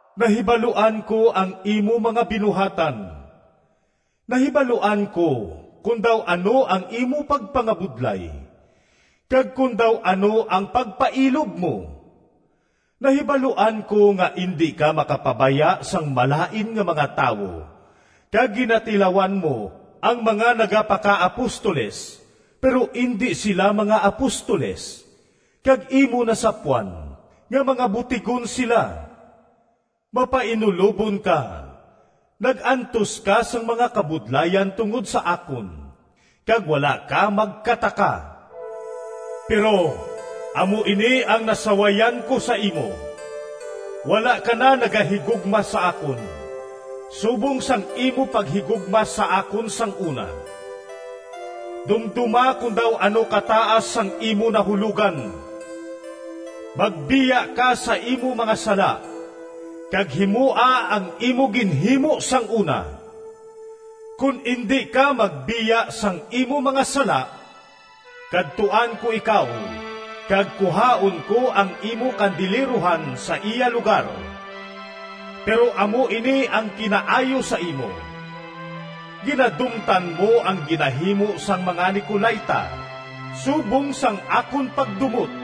Nahibaluan ko ang imo mga binuhatan. Nahibaluan ko kon daw ano ang imo pagpangabudlay, kag kon daw ano ang pagpailob mo. Nahibaluan ko nga indi ka makapabaya sang malain nga mga tawo kag ginatilawan mo ang mga nagapakaapostoles, pero indi sila mga apostoles, kag imo nasapwan nga mga butigon sila. Mapainulobon ka, nag-antos ka sang mga kabudlayan tungod sa akon, kag wala ka magkataka. Pero amo ini ang nasawayan ko sa imo: wala ka na nagahigugma sa akon subong sang imo paghigugma sa akon sang una. Dumdoma kon daw ano kataas sang imo nahulogan! Magbiya ka sa imo mga sala kag himoa ang imo ginhimo sang una. Kon indi ka magbiya sang imo mga sala, kadtuan ko ikaw kag kuhaon ko ang imo kandilerohan sa iya lugar. Pero amo ini ang kinaayo sa imo: ginadumtan mo ang ginahimo sang mga Nicolaita subong sang akon pagdumot.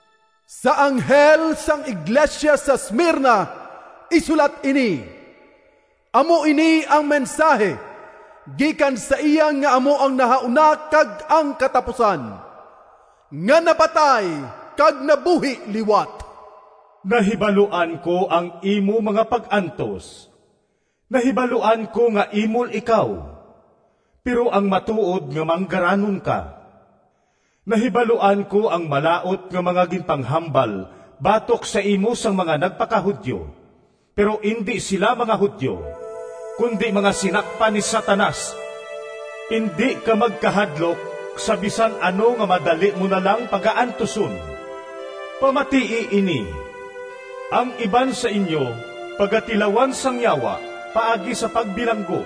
“Sa anghel sang iglesia sa Smirna, isulat ini: “Amo ini ang mensahi gikan sa iya nga amo ang nahauna kag ang katapusan, nga napatay kag nabuhi liwat. Nahibaluan ko ang imo mga pag-antos. Nahibaluan ko nga imol ikaw, pero ang matuod nga manggaranon ka! Nahibaluan ko ang malaut nga mga ginpanghambal batok sa imo sang mga nagpaka-Judio, pero indi sila mga Judio, kundi mga sinakpan ni Satanas! Indi ka magkahadlok sa bisan ano nga madali mo na lang pagaantuson. Pamatii ini! Ang iban sa inyo pagatilawan sang Yawa paagi sa pagbilanggo.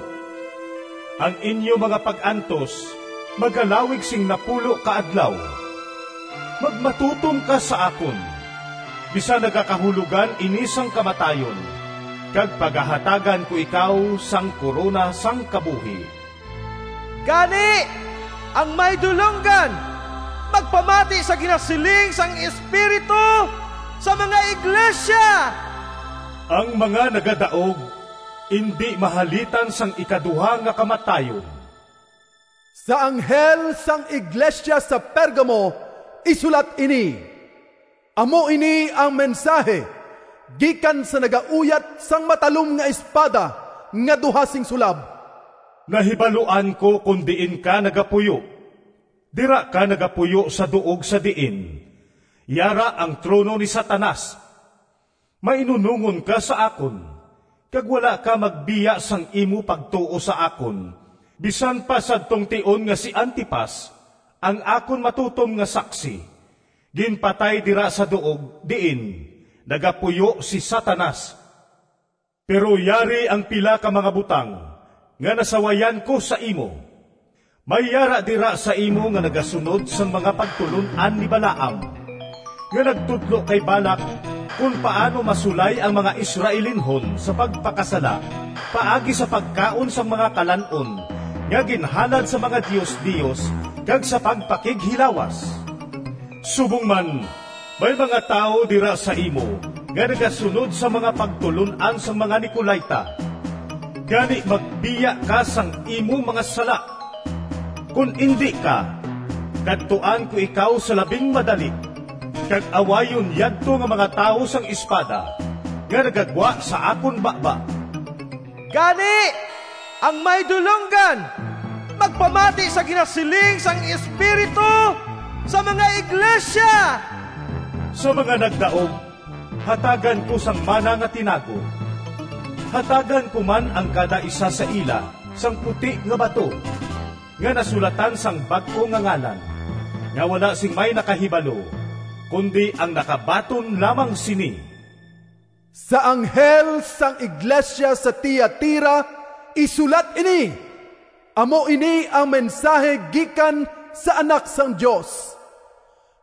Ang inyo mga pag-antos magalawig sing napulo ka adlaw. Magmatutom ka sa akon, bisan nagakahulogan ini sang kamatayon, kag pagahatagan ko ikaw sang korona sang kabuhi. “Gani, ang may dulonggan, magpamati sa ginasiling sang Espiritu sa mga iglesia! “Ang mga nagadaog indi mahalitan sang ikaduha nga kamatayon.” “Sa anghel sang iglesia sa Pergamo, isulat ini: “Amo ini ang mensahi gikan sa nagauyat sang matalom nga espada nga duha sing sulab. Nahibaluan ko kon diin ka nagapuyo, dira ka nagapuyo sa duog sa diin yara ang trono ni Satanas. Mainunongon ka sa akon, kag wala ka magbiya sang imo pagtuo sa akon bisan pa sadtong tion nga si Antipas, ang akon matutom nga saksi, ginpatay dira sa duog diin nagapuyo si Satanas. Pero yari ang pila ka mga butang nga nasawayan ko sa imo: may yara dira sa imo nga nagasunod sang mga pagtulon-an ni Balaam, nga nagtudlo kay Balac kon paano masulay ang mga Israelinhon sa pagpakasala paagi sa pagkaon sang mga kalan-on nga ginhalad sa mga diosdios kag sa pagpakighilawas. Subong man, may mga tawo dira sa imo nga nagasunod sang mga pagtulon-an sang mga Nicolaita. Gani magbiya ka sang imo mga sala! Kon indi ka, kadtuan ko ikaw sa labing madali, kag awayon yadto nga mga tawo sang espada nga nagagwa sa akon baba. “Gani, ang may dulonggan, magpamati sa ginasiling sang Espiritu sa mga iglesia! “Sa mga nagdaog hatagan ko sang mana nga tinago. Hatagan ko man ang kadaisa sa ila sang puti nga bato, nga nasulatan sang bag-o nga ngalan, nga wala sing may nakahibalo, kundi ang nakabaton lamang sini.” “Sa anghel sang iglesia sa Tiatira, isulat ini: “Amo ini ang mensahi gikan sa Anak sang Dios,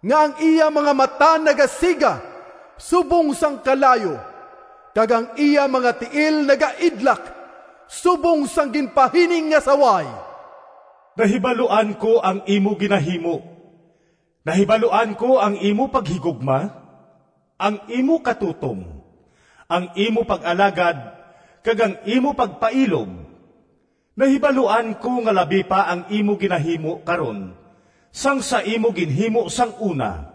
nga ang iya mga mata nagasiga subong sang kalayo kag ang iya mga tiil nagaidlak subong sang ginpahining nga saway. Nahibaluan ko ang imo ginahimo. Nahibaluan ko ang imo paghigugma, ang imo katutom, ang imo pag-alagad, kag ang imo pagpailob. Nahibaluan ko nga labi pa ang imo ginahimo karon sang sa imo ginhimo sang una.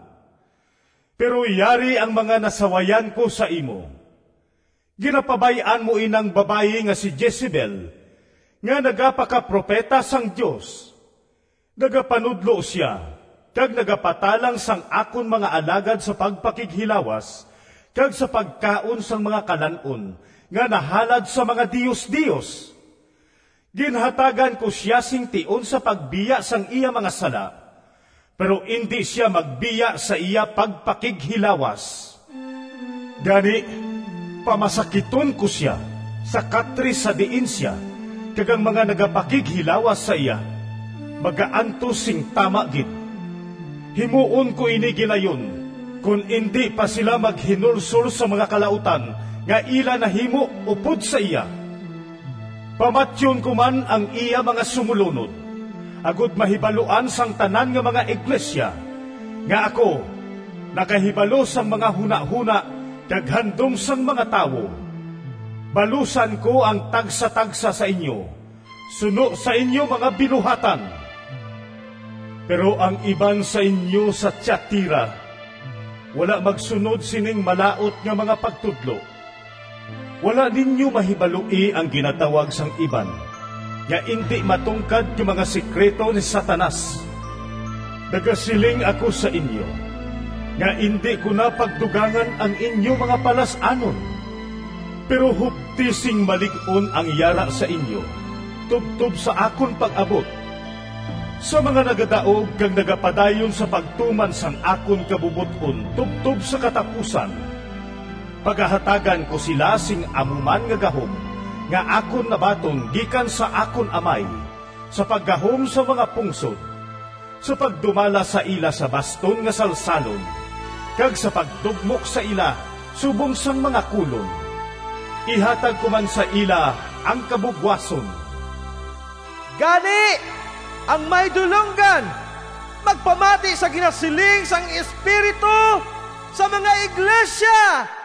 Pero yari ang mga nasawayan ko sa imo: ginapabay-an mo inang babayi nga si Jezebel, nga nagapakapropeta sang Dios. Nagapanudlo sia kag nagapatalang sang akon mga alagad sa pagpakighilawas kag sa pagkaon sang mga kalan-on nga nahalad sa mga diosdios. Ginhatagan ko sia sing tion sa pagbiya sang iya mga sala, pero indi sia magbiya sa iya pagpakighilawas. Gani, pamasakiton ko sia, sa katre sa diin sia kag ang mga nagapakighilawas sa iya magaantos sing tama gid. Himuon ko ini gilayon kon indi pa sila maghinulsol sang mga kalautan nga ila nahimo upod sa iya. Pamatyon ko man ang iya mga sumolunod, agod mahibaluan sang tanan nga mga iglesia nga ako nakahibalo sang mga hunahona kag handom sang mga tawo. Balusan ko ang tagsatagsa sa inyo suno sa inyo mga binuhatan. “Pero ang iban sa inyo sa Tiatira wala magsunod sining malaut nga mga pagtudlo. Wala ninyo mahibaloi ang ginatawag sang iban nga ‘indi matungkad nga mga sekrito ni Satanas.’ Nagasiling ako sa inyo nga indi ko na pagdugangan ang inyo mga palas-anon. Pero hupti sing malig-on ang yara sa inyo, tubtob sa akon pag-abot. Sa mga nagadaog kag nagapadayon sa pagtuman sang akon kabubot-on tubtob sa katapusan, pagahatagan ko sila sing amo man nga gahom nga akon nabaton gikan sa akon Amay sa paggahom sang mga pungsod, sa pagdumala sa ila sa baston nga salsalon kag sa pagdugmok sa ila subong sang mga kolon. Ihatag ko man sa ila ang kabugwason. “Gani, ang may dulonggan, magpamati sa ginasiling sang Espiritu sa mga iglesia!”